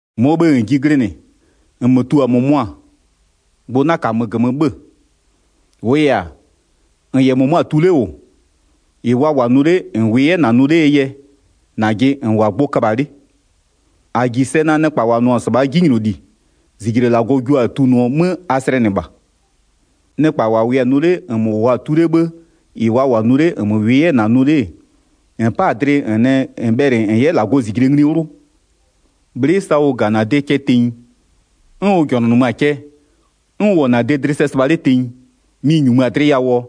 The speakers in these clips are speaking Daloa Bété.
1-Mɔɔ bhë -n ji glɩnɩ, -nmö tu-a -mʋmʋa, gbʋ 'na -kamö -gömö 'bhö-ö. -Wʋʋ yɛ-a, -n -yɛ -mʋmʋa tu 'le -wʋ, -ɩ wa -wʋ-a nʋ 'le -n -wʋɩ 'yɛ -na nʋ 'lee yɛ, -najɩ -n -wʋ-a gbʋ köbha-a 'le. 2-A -ji sɛ naa nɩkpa -wa nʋ-ɔ -sɩbhaa 'jinyloli, -zijle -Lagɔ jua-a tunʋɔ 'mö a slɛnɩ -bha. Nɩkpa -wa -wʋɩ-a nʋ 'le -nmö -wʋʋa-a tu 'le 'bhë -ɩ wa -wʋ-a nʋ 'le, -nmö -wʋɩ 'yɛ-ɛ -na nʋ 'le-e, -n 'pa-a dlɩ -n nɛ -n bhɛlɩ -n 'yɛ -Lagɔɔ -zijle ngli 'wlʋ? Bhlɩ'ɩ sa ʋ -ga-a -na de cɛ tenyi, 'n ʋ -jɔnʋnʋmö-a cɛ, 'n ʋ -wʋ-ɔ -na de dlɩ sɛ sɩbha 'le tenyi, mɩ-ɩ -nyumö-a dlɩ yawʋɔ?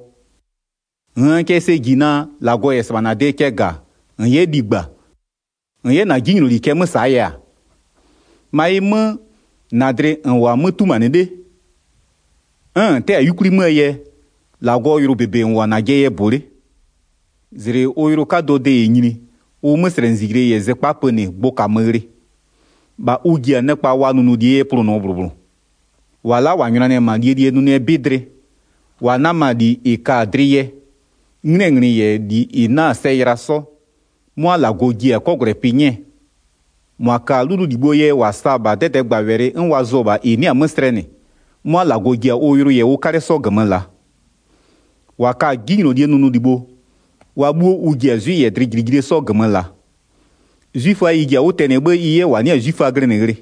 -Nn cɛ sɛ -ji naa, -Lagɔ -yɛ -sɩbha -na de cɛ -ga-a, -n 'yɛ ligba, -n 'yɛ -na 'jinyloli cɛ 'mö -saa yɛ-a? 5-Ma ɩ 'mö, -na dlɩ -n -wʋ-a 'mö 'tumanɩ 'le, 'n -n 'tɛ-a 'yukwli 'möö yɛ, -Lagɔɔ yʋlʋ -bebe -n -wʋ-a -najɩɛ yɛ -bʋ 'le. -Zlɩ ʋ yʋlʋ 'kadʋɔ de -yɛ nyini, ʋ 'möslɛnɩzijle -yɛ zɩkpa pönɩ gbʋ -kamö ghlɩ. 6-Bha ʋ ji-a nɩkpa wa nʋnʋlie yɛ plʋnʋɔ -bhlʋ -bhlʋ. 7-Wa la'a -wa nyʋnanɩ-ɛ -ma -lie -lie nʋnʋɛ 'bɩ dlɩ, -wa 'nama-a -li -ɩ ka-a dlɩ yɛ, 'nglɩɛ nglɩ -yɛ -li -ɩ 'na-a sɛ yɩla 'sɔ, 'mʋa -Lagɔ ji-a 'kɔgwlɛpɩ 'nyɛɛ. 8-Mʋa ka-a 'lʋlʋlibhoo yɛ -wa sa-a -bha 'dɛdɛɛgbawɛlɩ 'n wa zʋ-ɔ -bha -ɩ 'nɩ-a 'mö slɛnɩ, 'mʋa -Lagɔ ji-a ʋ yʋlʋ -yɛ ʋ 'kalɛ 'sɔ -gömö -laa. 9-Wa ka-a 'jinylolie nʋnʋlibho, wa 'bhuo ʋ ji-a 'zwɩ -yɛ dlɩjilijilie 'sɔ -gömö -laa. 'Zwiföa ɩ ji-a 'wʋ tɛnɩɛ 'bhë ɩ 'yɛ -wa 'nɩ-a 'zwiföa glɩnɩ ghlɩ.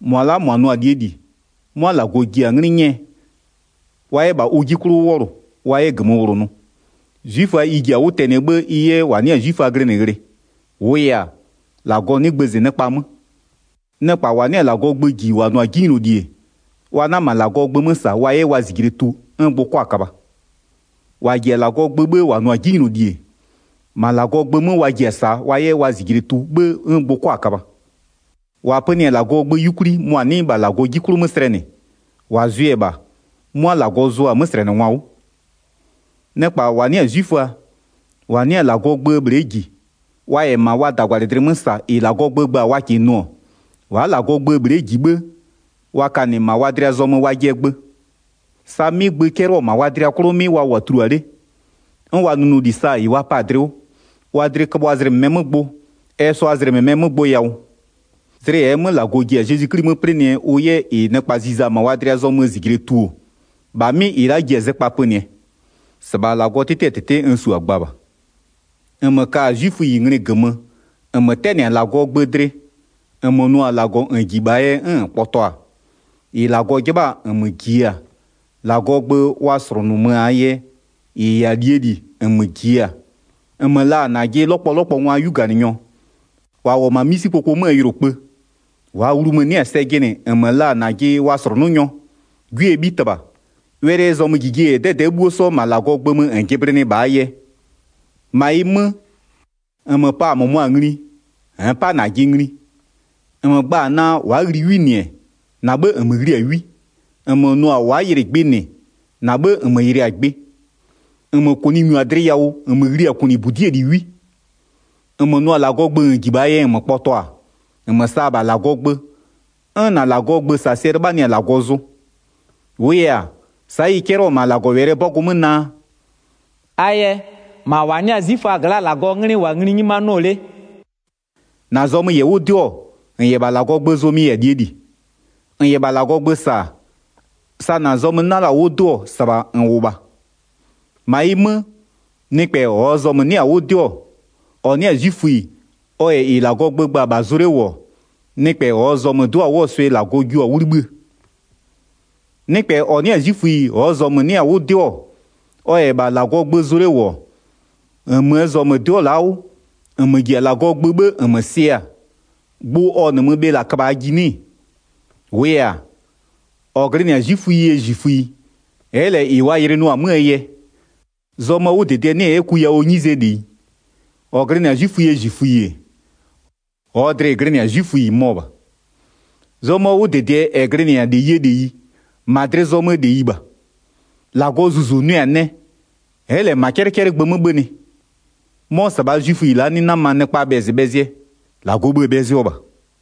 10-Mʋa la'a -mʋa nʋ-a -lie -li, 'mʋa -Lagɔ ji-a 'nglɩ 'nyɛɛ, wa 'yɛ -bha ʋ 'ji 'klʋ 'wʋ 'wɔlʋ, wa 'yɛ -gömö -wlonʋ. 'Zwiföa ɩ ji-a 'wʋ tɛnɩɛ 'bhë ɩ 'yɛ -wa 'nɩ-a 'zwiföa glɩnɩ ghlɩ. 11-Wʋʋ yɛ-a, -Lagɔ 'nɩ gbëzɩ nɩkpa 'mö. Pɔlʋ yɛ -wa -ji-a -Lagɔɔ gböö 'jinylolie gbʋ gba 12Nɩkpa -wa 'nɩ-a -Lagɔɔ gbö -ji -wa nʋ-a 'jinyloli-e, wa 'na -ma -Lagɔɔ gbö 'mö -sa wa 'yɛ wa -zijle tu 'n gbʋ 'kʋa-a köbha. -Wa -ji-a -Lagɔɔ gbö 'bhë -wa nʋ-a 'jinyloli-e, -ma -Lagɔɔ gbö 'mö wa ji-a -saa wa 'yɛ wa -zijle tu 'bhë 'n gbʋ 'kʋa-a köbha. 13-Wa pönɩ-a -Lagɔɔ gbö 'yukwli, mʋa 'nɩ -bha -Lagɔɔ 'ji 'klʋ 'mö slɛnɩ, -wa zʋɩ-ɛ -bha, 'mʋa -Lagɔ zʋa-a 'möslɛnɩngwa 'wʋ. 14Nɩkpa -wa 'nɩ-a 'zwiföa, -wa 'nɩ-a -Lagɔɔ gböö bhle'e -ji, wa -yɛ -ma wa -dagwalɩdlɩ 'mö -sa -ɩ -Lagɔɔ gbö gba-a wa -kɩɩ nʋ-ɔ, wa'a -Lagɔɔ gböö bhle'e -ji 'bhë, wa ka -nɩ -ma wa dlɩa zɔmö wajɩɛ gbö. 15Sa 'mɩ gbö 'cɛlɩɔ-ɔ -ma wa dlɩ 'klʋ 'mɩ wa -wʋ-a tulua 'le, 'n wa nʋnʋli sa-a -ɩ wa pa-a dlɩ 'wʋ, wa dlɩ köbhʋa zlɩ -mɩmɛɛ 'mö gbʋ, ɛ sʋa 'yɛ zlɩ -mɩmɛɛ 'mö gbʋ yawʋ. 16Zlɩ -ɛɛ 'mö -Lagɔ ji-a Zezwi 'Kli 'mö 'plɩnɩɛ ʋ 'yɛ -ɩ nɩkpa ziza-a -ma wa dlɩa zɔmöö -zijle tu-o, -bha 'mɩ -ɩ la'a ji-a zɩkpa pönɩɛ. -Sɩbha -Lagɔɔ 'tɩtɩɛ -tɩtɩ n -su-a gba -bha. 'Zwiföa -yɛ -Lagɔɔ gbö 'sɔ 17-Nmö ka-a 'zwiföyi nglɩ -gömö, -nmö 'tɛnɩ-a -Lagɔɔ gbö dlɩ, -nmö nʋ-a -Lagɔ -n -ji -bhaa yɛ 'n -n kpɔtɔ-a, 18-ɩ -Lagɔ 'jɩbha-a -nmö jiɩ-a, -Lagɔɔ gbö wa -slʋnʋmö-aa yɛ -ɩ -yɛ-a -lie -li -nmö -jiɩ-a, 19-nmö la-a -najɩ 'lɔkpɔlɔkpɔngwaa 'yuganɩnyɔ, -wa -wʋ-ɔ -ma 'misikpoko 'möö yʋlokpë, 20-waa wlumö-ö 'nɩ-a sɛ jɩnɩ -nmö la-a -najɩ wa -slʋnʋnyɔ, 'gwiee 'bhitɩbha, wɛlɩɛ zɔmöjijie -yɛ 'dɛdɛ'ɛ 'bhuo 'sɔ -ma -Lagɔɔ gbö 'mö -n jɩblɩnɩɩ -bhaa yɛ. 21-Ma ɩ 'mö, -nmö pa-a -mʋmʋa ngli, -nn 'pa -najɩ ngli! -Nmö gba-a naa, wa'a ghli 'wi -nɩ-ɛ, -na 'bhë -nmö ghli-a 'wi! -Nmö nʋ-a wa'a yɩlɩ gbɩ -nɩ, -na 'bhë -nmö yɩlɩ-a gbɩ. 22-Nmö -kʋnɩ -nyu-a dlɩ yawʋ, -nmö ghli-a -kʋnɩbudi'ie -li 'wi! 23-Nmö nʋ-a -Lagɔɔ gbö -n -ji -bhaa yɛ, -nmö kpɔtɔ-a, -nmö sa-a -bha -Lagɔɔ gbö, 'n -na -Lagɔɔ gbösasɩɛ 'lɩbhanɩ-a -Lagɔ zʋ. 24-Wʋʋ yɛ-a, sa'a ɩ 'cɛlɩɔ-ɔ -ma -Lagɔwɛlɩɛ 'bɔgʋ 'mö naa: “A yɛ, -ma -wa 'nɩ-a 'zwiföaa gla'a -Lagɔɔ 'nglɩ -wʋ-ɔ -ma ngli 'nyimanɩɔ 'le.” Zɔmöö 'wʋdɩdɩɛ -ɛ -yɛ-a -leyie -leyi 25-Na zɔmö -yɛ 'wʋ 'dɩɔ-ɔ, -n -yɛ -bha -Lagɔɔ gbö zʋ, mɩ-ɩ -yɛ-a -lie -li. -N -yɛ -bha -Lagɔɔ gbö -sa-a, sa -na zɔmö 'na la-a 'wʋ 'dɩɔ, -sɩbha -n -wʋ -bha. 26-Ma ɩ 'mö, nɩkpɛ -ɔɔ zɔmö-ö 'nɩ-a 'wʋ 'dɩɔ, -ɔ 'nɩ-a 'zwiföyi, ɔ -yɛ -ɩ -Lagɔɔ gbö gba-a -bha zʋ 'le -wʋ-ɔ, nɩkpɛ -ɔɔ zɔmö 'dɩɔ-a 'wʋɔ swɩ -Lagɔ jio-a 'wʋ 'libhïë. 27Nɩkpɛ -ɔ 'nɩ-a 'zwiföyi -ɔɔ zɔmö-ö 'nɩ-a 'wʋ 'dɩɔ-ɔ, ɔ -yɛ -bha -Lagɔɔ gbö zʋ 'le -wʋ-ɔ, -nmöö zɔmö-ö 'dɩɔ la-a 'wʋ, -nmö -ji-a -Lagɔɔ gbö 'bhë -nmö sɩ-a, gbʋ ɔ -nɩmö bhe -la köbhaa ji 'nɩ-ɩ? 28-Wʋʋ yɛ-a, -ɔ glɩnɩ-a 'zwiföyie -zwiföyi, ɛ'ɛ -lɛ -ɩ wa yɩlɩnɩɔ-a 'möö yɛ, zɔmöö 'wʋdɩdɩɛ 'nɩ-ɛ 'yɛ ku yawʋɔ 'nyizee -leyi. 29-Ɔ glɩnɩ-a 'zwiföyie -zwiföyi-e, -ɔɔ dlɩ-ɩ glɩnɩ-a 'zwiföyi mɔ-ɔ -bha. Zɔmöö 'wʋdɩdɩɛ -ɛ glɩnɩ-a -leyie -leyi, -ma dlɩ zɔmöö -leyi -bha. -Lagɔɔ Zuzu nʋɛ-a nɛ, ɛ'ɛ -lɛ -ma 'cɛlɩcɛlɩgbö 'mö 'bhönɩ. 'Mɔ -sɩbhaa 'zwiföyi la'a 'nɩ 'nama nɩkpaa bhɛzɩbhɛzɩɛ, -Lagɔɔ bhë-ë bhɛzɩɔ -bha.